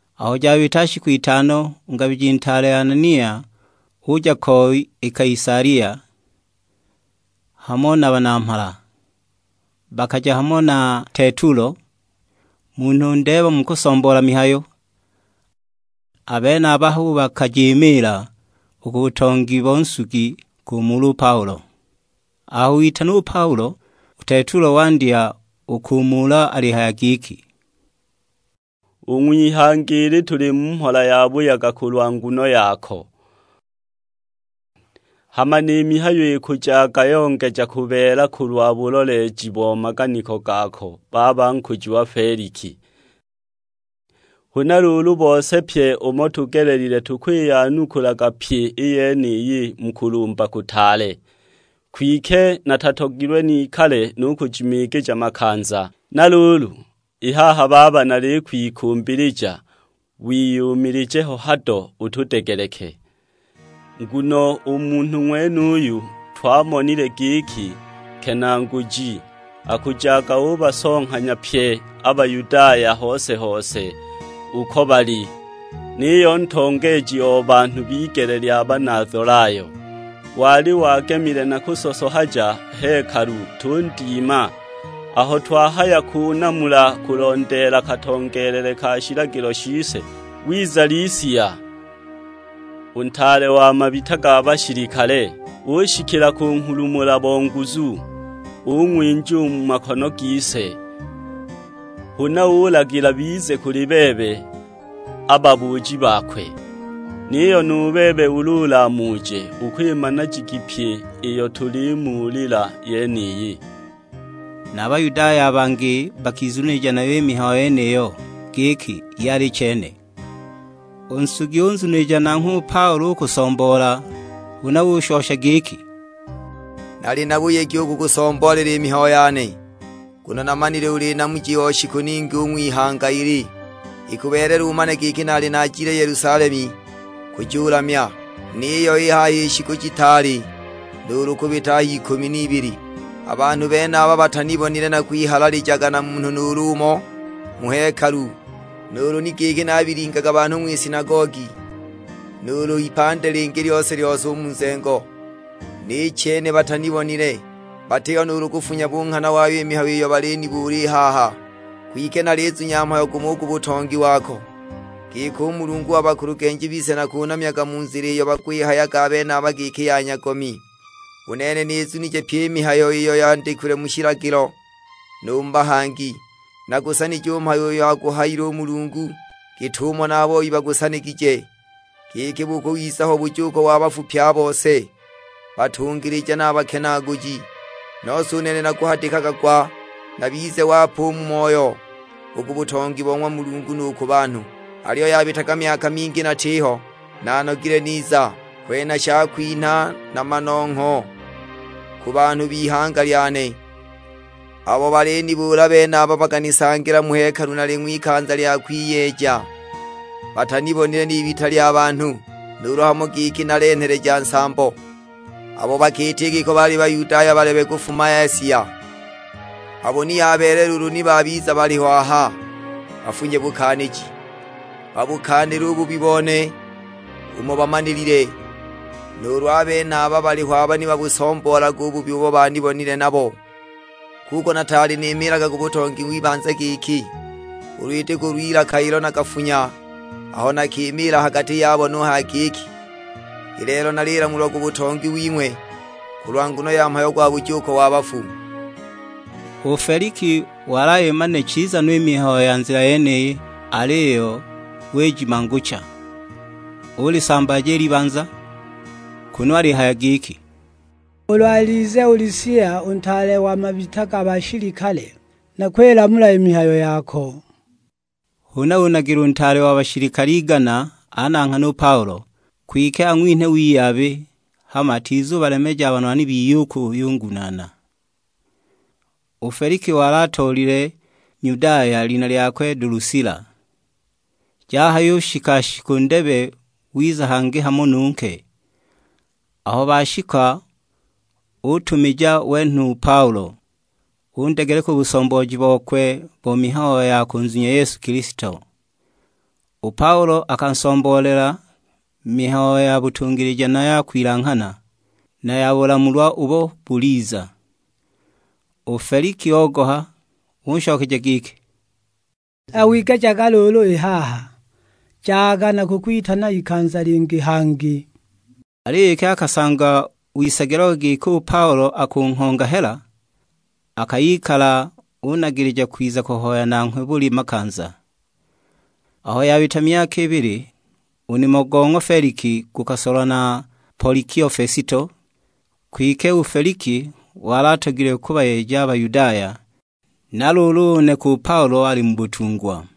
Aho jabita shiku itano, u ngabiji ntaale Anania uja ko i Kaisalia, hamo na banamhala. Bakaja hamo na Tetulo, munhu ndeeba mu kusomboola mihayo; a benaba hu bakajimiila u ku butongi bo nsugi kumuula u Paulo. Aho witanwa u Paulo, u Tetulo wandya u kumuula alihaya giki, "U ng'wihanga ili tuli mu mhola yabuyaga kulwa nguno yako; hama ni mihayo ikujaga yongeja kubeela kulwa buloleeji bo maganiko gako baba nkujiwa Feliki. Huna luulu, bose pye umo tugelelile tukwiyanukulaga pyi i yeniyi mu kulumba kutaale. Kwike natatogilwe nikale nukujimiigija makanza; na luulu i haha baba nalikwikumbilija wiyumilije ho hado utudegeleke. Nguno u munhu ng'wenuyu twamonile giki nkenaaguji, akujaga ubasonghanya pye a Bayudaya hose-hose uko bali; niyo ntongeeji o banhu b'igele lya Banazolayo. Wali wagemile na kusosohaja hekalu, tundima; aho twahaya kunamula kulondeela katongeelele ka shilagilo shise, wiza Lisia, u ntaale wa mabita ga bashilikale, ushikila kunghulumula bo nguzu, ung'winja u mu makono gise. Huna ulagila bize kuli bebe a babuuji bakwe. Niyo nu bebe ulu ulamuje ukwimana jigi pyi iyo tulimuulila yeniyi." Na a Bayudaya a bangi bakizunilija nayo i mihayo yeniyo, giki yali chene. U nsugi unzunilija nanghwe u Paulo u kusomboola; huna ushosha giki, "Nali na buyegi u kukusomboolela i mihayo yane, nguno namanile uli namuji o shiku ningi u ng'wihanga ili. Ikubeelela umane giki naali naajile Yelusalemu kujulamya, niyo i haha i shiku jitaali nuulu kubita a h'ikumi n'ibili. A banhu benaba batanibonile nakwihalalijaga na munhu nuulu umo mu hekalu; nuulu ni giki nabilingaga banhu ng'wisinagogi, nuulu h'ipandi lingi lyose-lyose u mu nzengo, ni chene batanibonile. Batiho nuulu kufunya bunghana wayo i mihayo iyo balinibuula i haha. Kwike nalizunya mhayo gumo u ku butongi wako; giki u Mulungu wa bakulugenji bise nakunamyaga mu Nzila iyo bakwihayaga a benaba giki ya nyagomi. U nene nizunije pyi i mihayo iyo yandikilwe mu shilagilo, nu mu bahangi. Nagusanije u mhayo uyo aguhayile u Mulungu, git'umo na a boi bagusanigije; giki bukubiza ho bujuuko wa bafu pye a bose, batungilija na a bakenaaguji. Nose u nene nakuhadikaga gwa, nabize wape u mu moyo, u ku butongi bo ng'wa Mulungu nu ku banhu. "Aliyo yabitaga myaka mingi natiho, naanogile niza; kwenha shakwinha na manongho ku banhu b'ihanga lyane. Abo balinibuula benaba bakanisangila mu hekalu nali ng'wikanza lya kwiyeeja; batanibonile n'ibita lya banhu, nuulu hamo giki nalenheleja nsambo. Abo bakiita i giko baali Bayudaya balebe ba kufuma Asia, abo ni yabeelela ulu ni babiza baliho aha, bafunye bukaaniji, babukaanile u bubi bone umo bamanilile. Nuulu a benaba baliho aba ni babusomboolage u bubi ubo banibonile nabo, kuko nataali nimiilaga ku butongi w'ibanza giki. Ulu iti kulw'ilaka ilo nakafunya aho nakimiila ha gati yabo nuhaya giki, 'I lelo nalilamulwa ku butongi wing'we kulwa nguno ya mhayo gwa bujuuko wa bafu.' " U Feliki wali ayimanile chiza no i mihayo ya Nzila yeniyi, aliyo wijimangucha. Ulisambaaja i libanza; kunu alihaya giki, "Ulu alize u Lisia u ntaale wa mabita ga bashilikale nakwilamula i mihayo yako." Huna unagila u ntaale wa bashilikale igana ananghane u Paulo; kwike ang'winhe wiyabi, hama atizubalemeja a banwani biye u kuyungunaana. U Feliki wali atoolile Nyudaya, lina lyakwe Dulusila. Jahayubita shiku ndebe wiza hangi hamo nu nke. Aho bashika utumija wenhwa u Paulo, undegeleka u busombooji bokwe bo mihayo ya kunzunya Yesu Kilisto. U Paulo akansomboolela mihayo ya butungilija na ya kwilanghana, na ya bulamulwa ubo buliza. U Feliki ogoha; unshokeja giki, "Wigejaga luulu i haha, jaga nakukwitana ikanza lingi hangi." Aliyo iki akasangwa wisagilagwa giki u Paulo akunghonga hela, akayikala unagilija kwiza kuhoya nanghwe buli makanza. Aho yabita myaka ibili u nimo go ng'wa Feliki gukasolwa na Polikio Fesito; kwike u Feliki wali atogilwe kubayeja a Bayudaya, na luulu uneka u Paulo ali mu butungwa.